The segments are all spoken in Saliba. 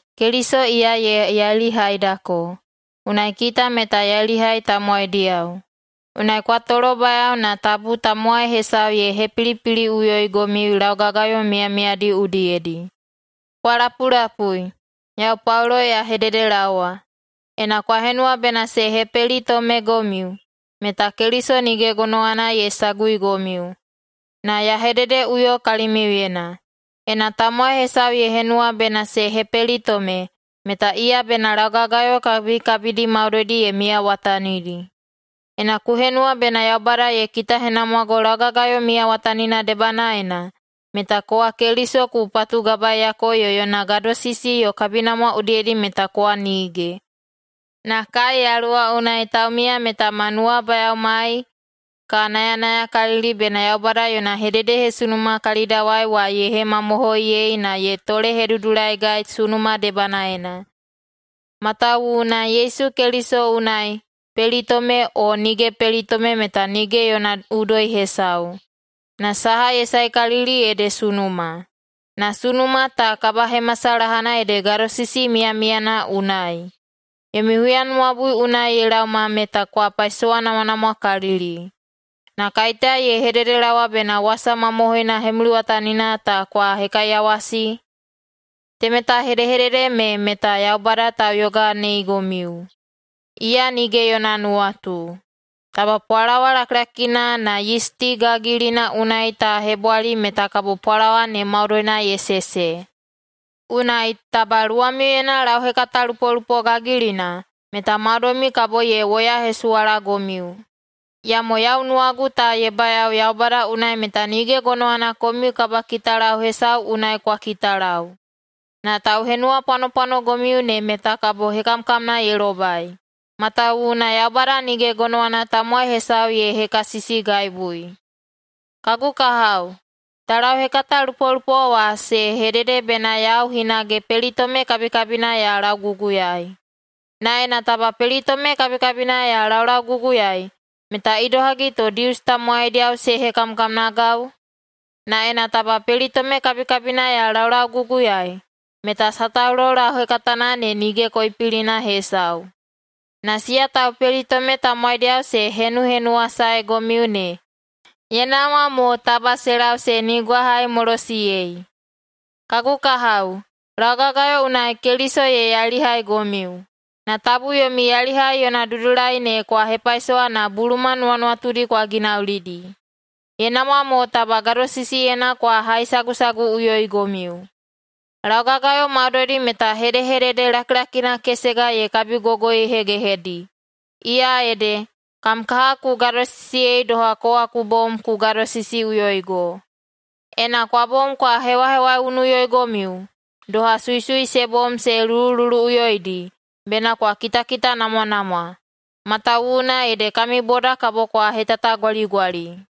Keliso iya ye yailihaidako, unai kita meta yailihai tamowaidiyao. Unai kwa tolobayao na tabu tamowai hesau ye hepilipiliꞌuyoigomiu laugagayo miyamiyadi udiyedi. Kwa lapulapui, yau Paulo ya hededelaowa: Ena kwa henuwa bena se hepelitomegomiu, meta Keliso nige gonowana ye saguigomiu. Na ya hededeꞌuyo kalimiuyena: Ena tamowai hesau ye henuwa bena se hepelitome, meta iya bena laugagayo kabikabidi maudoidi ye miyawatanidi. Ena ku henuwa bena Yaubada ye kitahenamwago laugagayo miyawatanina debanaena, meta kowa Keliso ku patugabaiyako yo yona gadosisi yo kabinamwa udiyedi meta kowa nige. Na kai Yaluwa unai taumiya meta ma nuwabayaomai ka nayanayakalili bena Yaubada yona hededehesunuma kalidawai wa ye hemamohoiyei na ye tolehedudulaigai sunuma debanaena. Matawuwuna Yesu Keliso unai pelitome o nige pelitome meta nige yona udoi hesau. Na saha ye saekalili ede sunuma, na sunuma ta kabahemasalahana ede gadosisi miyamiyana unai. Yomi huyanuwabui unai ye laoma meta kwa paisowanamwanamwakalili, na kaiteya ye hededelaowa bena wasa mamohoina hemuliwatanina ta kwa hekaiyawasi? Temeta hedehedede me meta Yaubada tauyoganeigomiu, iya nige yona nuwatu. Taba pwalawa lakilakina na yisti gagilina unai ta hebwali meta kabo pwalawa ne maudoina ye sese. [Unai, taba luwamiuyena lauhekatalupolupo gagilina, meta maudoimiu kabo ye woyahesuwalagomiu.] Iyamo yau nuwagu ta ye bayao Yaubada unai meta nige gonowana komiu kabakitalau hesau unai kwa kitalau. Na tauhenuwapwanopwanogomiu ne meta kabo hekamkamna ye lobai, matawuwuna Yaubada nige gonowana tamowai hesau ye hekasisigaibui. Kagu kahao, taulauhekatalupolupo wa se hedede bena yau hinage pelitome kabikabina ya lauguguyaei. Na ena taba pelitome kabikabina ya laulauguguyaei, meta idohagi to Dius tamowaidiyao se hekamkamnagau? Na ena taba pelitome kabikabina ya laulauguguyaei, meta sataulo lauhekatana ne nige koipilina hesau. Na siya taupelitome tamowaidiyao se henuhenuwasaegomiu ne, ye namwa mo taba se lau se nigwahaimolosiyei. Kagu kahao, laugagayo unai Keliso ye yailihaigomiu. Na tabu yomi yailihai yona dudulai ne kwa hepaisowa na buluma nuwanuwatudi kwa ginaulidi. Ye namwa mo taba gadosisiyena kwa haisagusaguꞌuyoigomiu. Laugagayo maudoidi meta hedehedede lakilakina kesega ye kabigogoihegehedi, iya ede, “Kam kaha ku gadosisiyei doha kowa ku bom ku gadosisiꞌuyoigo.” Ena kwa bom kwa hewahewaiunuꞌuyoigomiu, doha suisui se bom se lulululuꞌuyoidi, bena kwa kitakitanamwanamwa, matawuwuna ede kami boda kabo kwa hetatagwaligwali.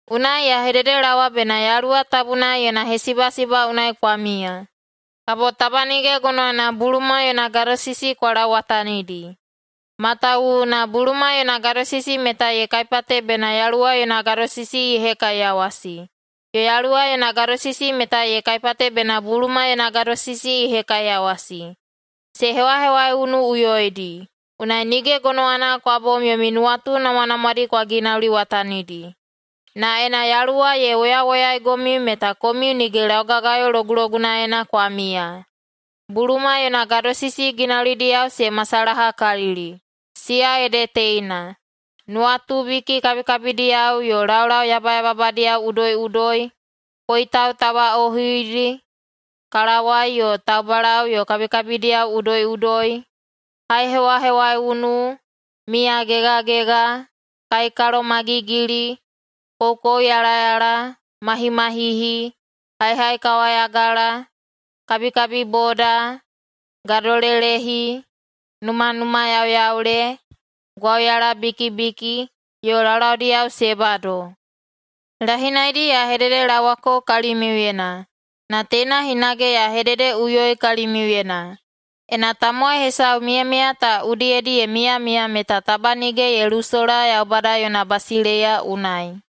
Unai ya hededelaowa bena Yaluwa Tabuna yona hesibasiba unai kwa miya, kabo taba nige gonowana buluma yona gadosisi kwa lauwatanidi. Matawuwuna buluma yona gadosisi meta ye kaipate bena Yaluwa yona gadosisi ye hekaiyawasi, yo Yaluwa yona gadosisi meta ye kaipate bena buluma yona gadosisi ye hekaiyawasi. Se hewahewaiunuꞌuyoidi, unai nige gonowana kwa bom yomi nuwatu namwanamwadi kwa ginauliwatanidi. Na ena Yaluwa ye woyawoyaigomiu meta komiu nige laugagayo logulogunaena kwa miya. Buluma yona gadosisi ginaulidiyao se masalahakalili, siya ede teina: nuwatubiki kabikabidiyao yo laulau yabayababadiyao udoiꞌudoi, koitau tabaꞌohuidi, kalawai yo taubalau yo kabikabidiyao udoiꞌudoi, haihewahewaiunu, miyagegagega, kaikalomagigili, koukouyalayala, mahimahihi, haihaikawayagala, kabikabiboda, gadolelehi, numanumayauyaule, gwauyalabikibiki, yo laulaudiyao se bado. Lahinaidi ya hededelaowako kalimiuyena, na teina hinage ya hededeꞌuyoi kalimiuyena: Ena tamowai hesau miyamiya ta udiyedi ye miyamiya meta taba nige ye lusola Yaubada yona basileiya unai.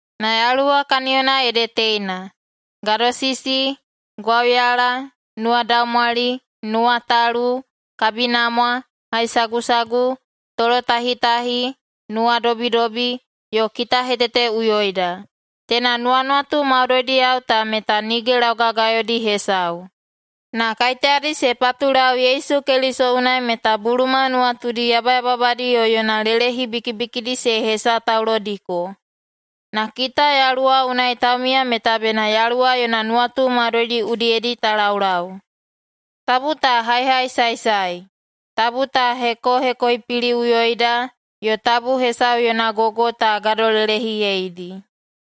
Na Yaluwa kaniyona ede teina: gadosisi, gwauyala, nuwadaumwali, nuwatalu, kabinamwa, haisagusagu, tolotahitahi, nuwadobidobi, yo kitaheteteꞌuyoida. Teina nuwanuwatu maudoidiyao ta meta nige laugagayodi hesau. Na kaiteyadi se patulau Yesu Keliso unai meta buluma nuwatudi yabayababadi yo yona lelehi bikibikidi se hesataulodiko. Na kita Yaluwa unai taumiya meta bena Yaluwa yona nuwatu maudoidi udiyedi ta laulau. Tabu ta haihaisaesae, tabu ta hekohekoipiliꞌuyoida, yo tabu hesau yona gogo ta gadolelehiyeidi.